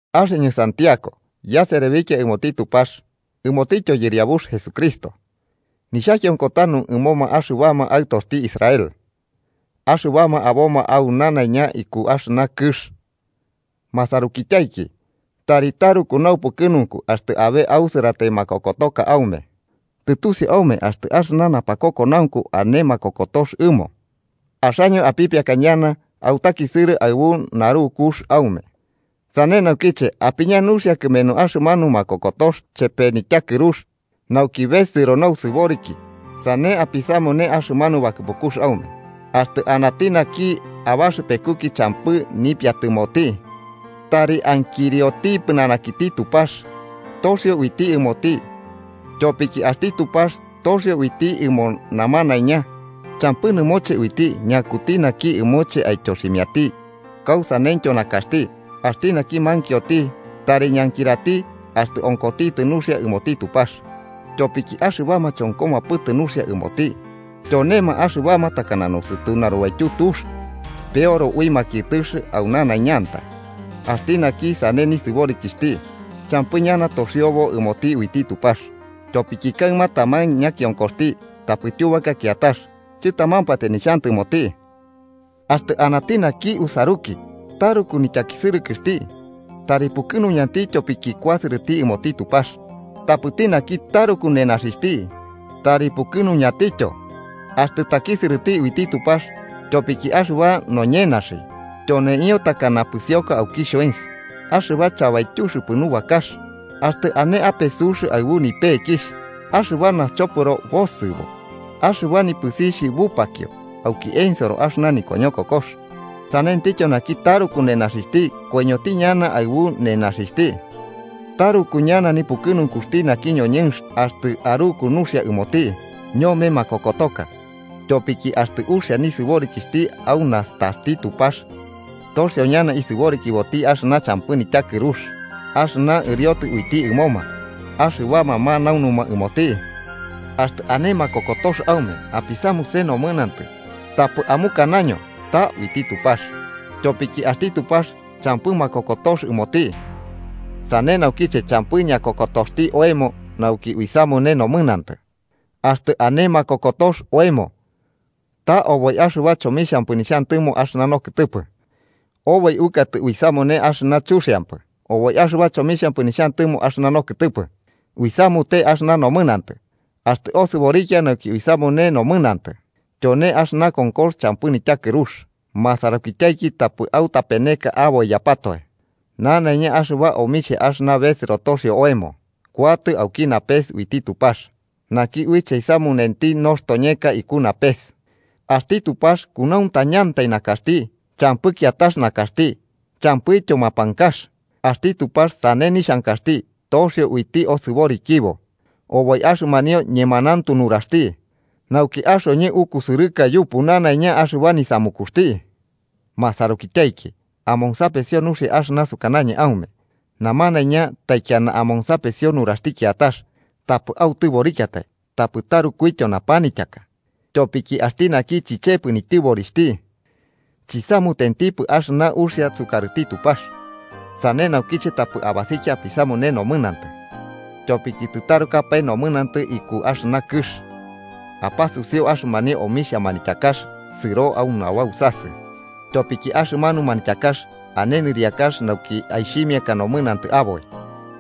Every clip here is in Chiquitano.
Axɨñɨ Santiago yaserebikia ɨmoti Tupax ɨmotityo Yɨriabux Jesucristo, nixhakionko tanu ɨmoma axɨbama aɨtoxti Israel axɨbama aboma au nanaiña iku axɨna kɨx. Masarukityaiki, tari taruku naupukɨnunku axtɨ abe ausɨratai makokotoka aume. Tɨtusiu aume, axtɨ axɨna napakokonaunku ane makokotox ɨmo, axaño apipiaka ñana autakisɨrɨ aɨbu narukux aume. Sane naukiche apiña nuxia kɨmenu axɨmanu makokotox chepe nityakɨrux, nauki besɨro nausɨboriki sane apisamune axɨmanu bakɨpukux aume. Axtɨ anati naki abaxɨpekuki champɨ nipiatɨmoti, tari ankirioti pɨnanakiti Tupax, toxio uiti ɨmoti. Tyopiki axti Tupax toxio uiti ɨmo namanaiña champɨ nɨmoche uiti ñakuti naki ɨmoche aityoximiati kausaneityo nakaxti. Axti naki mankioti, tari ñankirati axtɨ onkotitɨ nuxia ɨmoti Tupax, tyopiki axɨbama chonkopɨmatɨ nuxia ɨmoti tyonema axɨbama takana nosɨtu narubaityu tux, peoro ui makiɨtɨx au nanaiñantai. Axti naki sane nisɨborikixhti, champɨ ñana toxiobo ɨmoti uiti Tupax, tyopiki kaɨma taman ñakionkoxti tapɨ tyubaka kiatax, chɨtamampatai nixhantɨmoti. Axtɨ anati naki usaruki taruku nityakisɨrɨkɨxti, tari pukɨnuñati tyopiki kuasɨrɨti ɨmoti Tupax. Tapɨti naki taruku nenaxixhti, tari pukɨnuñantityo axtɨ takisɨrɨti uiti Tupax, tyopiki axɨba noñenaxi tyoneio takana pɨsioka auki xhoens axɨba chabaityuxɨpɨ nubakax. Axtɨ ane ape sux aɨbu nipekixh, axɨba naxchopɨro bosɨbo, axɨba nipɨsixh bupakio auki ensoro axɨna nikoñokokox. Sanentityo naki taruku nenaxixhti koiñoti ñana aɨbu nenaxixhti. Taruku ñana nipukɨnunkuxti naki ñoñɨnx axtɨ aruku nuxia ɨmoti ñome makokotoka, tyopiki axtɨ uxia nisɨborikixhti au nastaxti Tupax, toxio ñana isɨborikiboti axɨna champɨ nityakɨrux axɨna ɨriotɨ uiti ɨmoma axɨbama manaunuma ɨmoti. Axtɨ ane makokotox aume apisamune nomɨnantɨ, tapɨ amukanaño ta uiti Tupax, tyopiki axti Tupax champɨ makokotox ɨmoti, sane naukiche champɨ ñakokotoxti oemo nauki uisamune nomɨnantɨ. Axtɨ ane makokotox oemo, ta oboi axɨba chomixhampɨ nixhantɨmo axɨna nokɨtɨpɨ, oboi uɨkatɨ uisamune axɨna chuxiampɨ. Oboi axɨba chomixhampɨ nixhantɨmo axɨna nokɨtɨpɨ, uisamute axɨna nomɨnantɨ. Axtɨ osɨborikia nauki uisamune nomɨnantɨ, tyone axɨna konkox champɨ nityakɨrux. Masarukityaiki, tapɨ autapeneka aboiyapatoe: nanaiña axɨba omixhia axɨna besɨro toxio oemo, kuatɨ auki napes, uiti Tupax, naki uiche aisamunenti nostoñeka iku napes. Axti Tupax kunauntañantai nakaxti, champɨ kiatax nakaxti champɨityo mapankax. Axti Tupax sane nixhankaxti, toxio uiti osɨborikibo oboi axɨmanio ñemanauntu nuraxti, nauki axoñɨ ukusɨrɨka yupu nanaiña axɨba nisamukuxti. Masarukityaiki, amonsapesio nuxia axɨna sukanañɨ aume: namanaiña taikiana amonsapesio nuraxti kiatax, tapɨ autɨborikiatai tapɨ tarukuityo napanityaka. Tyopiki axti naki chichepɨ nityɨborixhti, chisamutentipɨ axɨna uxia sukarɨti Tupax. Sane naukiche, tapɨ abasikia apisamune nomɨnantɨ, tyopiki tɨtarukapae nomɨnantɨ iku axɨna kɨx. Apasusiu axɨmanio omixhia manityakax sɨro au nabausasɨ. Tyopiki axɨmanu manityakax ane nɨriakax nauki aixhimiaka nomɨnantɨ aboi.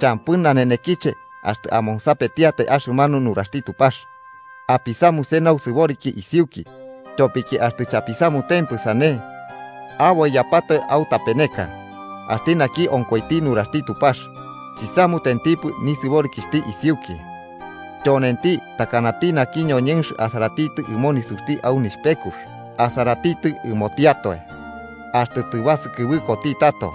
Champɨ nanenekiche axtɨ amonsapetiatai axɨmanu nuraxti Tupax. Apisamuse nausɨboriki isiuki, tyopiki axtɨ chapisamutempɨ sane, aboiyapatoe autapeneka. Axti naki onkoiti nuraxti Tupax, chisamutentipɨ nisɨborikixhti isiuki, tyonenti takanati naki ñoñɨnx asaratitɨ ɨmo nisuxti au nixhpekux: asaratitɨ ɨmotiatoe, axtɨ tɨbasɨkɨbɨkoti tato,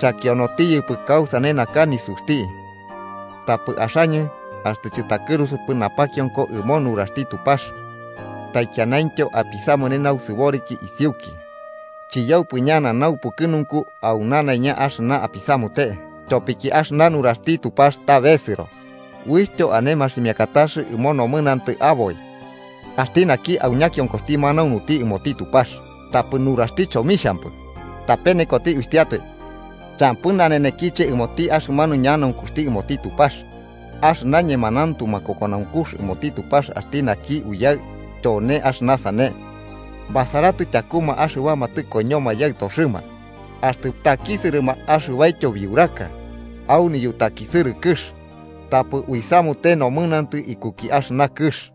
chakionotiyɨpɨ kausane naka nisuxti. Tapɨ axaño axtɨ chɨtakɨrusupɨ napakionko ɨmo nuraxti Tupax taikianaintyo apisamune nausɨboriki isiuki, chiyaupɨ ñana naupukɨnunku au nanaiña axɨna apisamute. Tyopiki axɨna nuraxti Tupax ta besɨro uixhtyo ane maximiakatax ɨmo nomɨnantɨ aboi. Axti naki au ñakionkoxti manaunuti ɨmoti Tupax, tapɨ nuraxti chomixhampɨ, tapenekoti uxhtiatoe champɨ nanenekiche ɨmoti axɨmanu ñanaunkuxti ɨmoti Tupax. Axɨna ñemanauntu makokonaunkux ɨmoti Tupax axti naki Uyaɨ tyone axɨna sane: basaratɨ tyakuma axɨbama tɨkoiñoma yaɨtoxɨma axtɨ takisɨrɨma axɨbaityo biuraka, au niyutakisɨrɨkɨx, tapɨ uisamute nomɨnantɨ ikuki axɨna kɨx.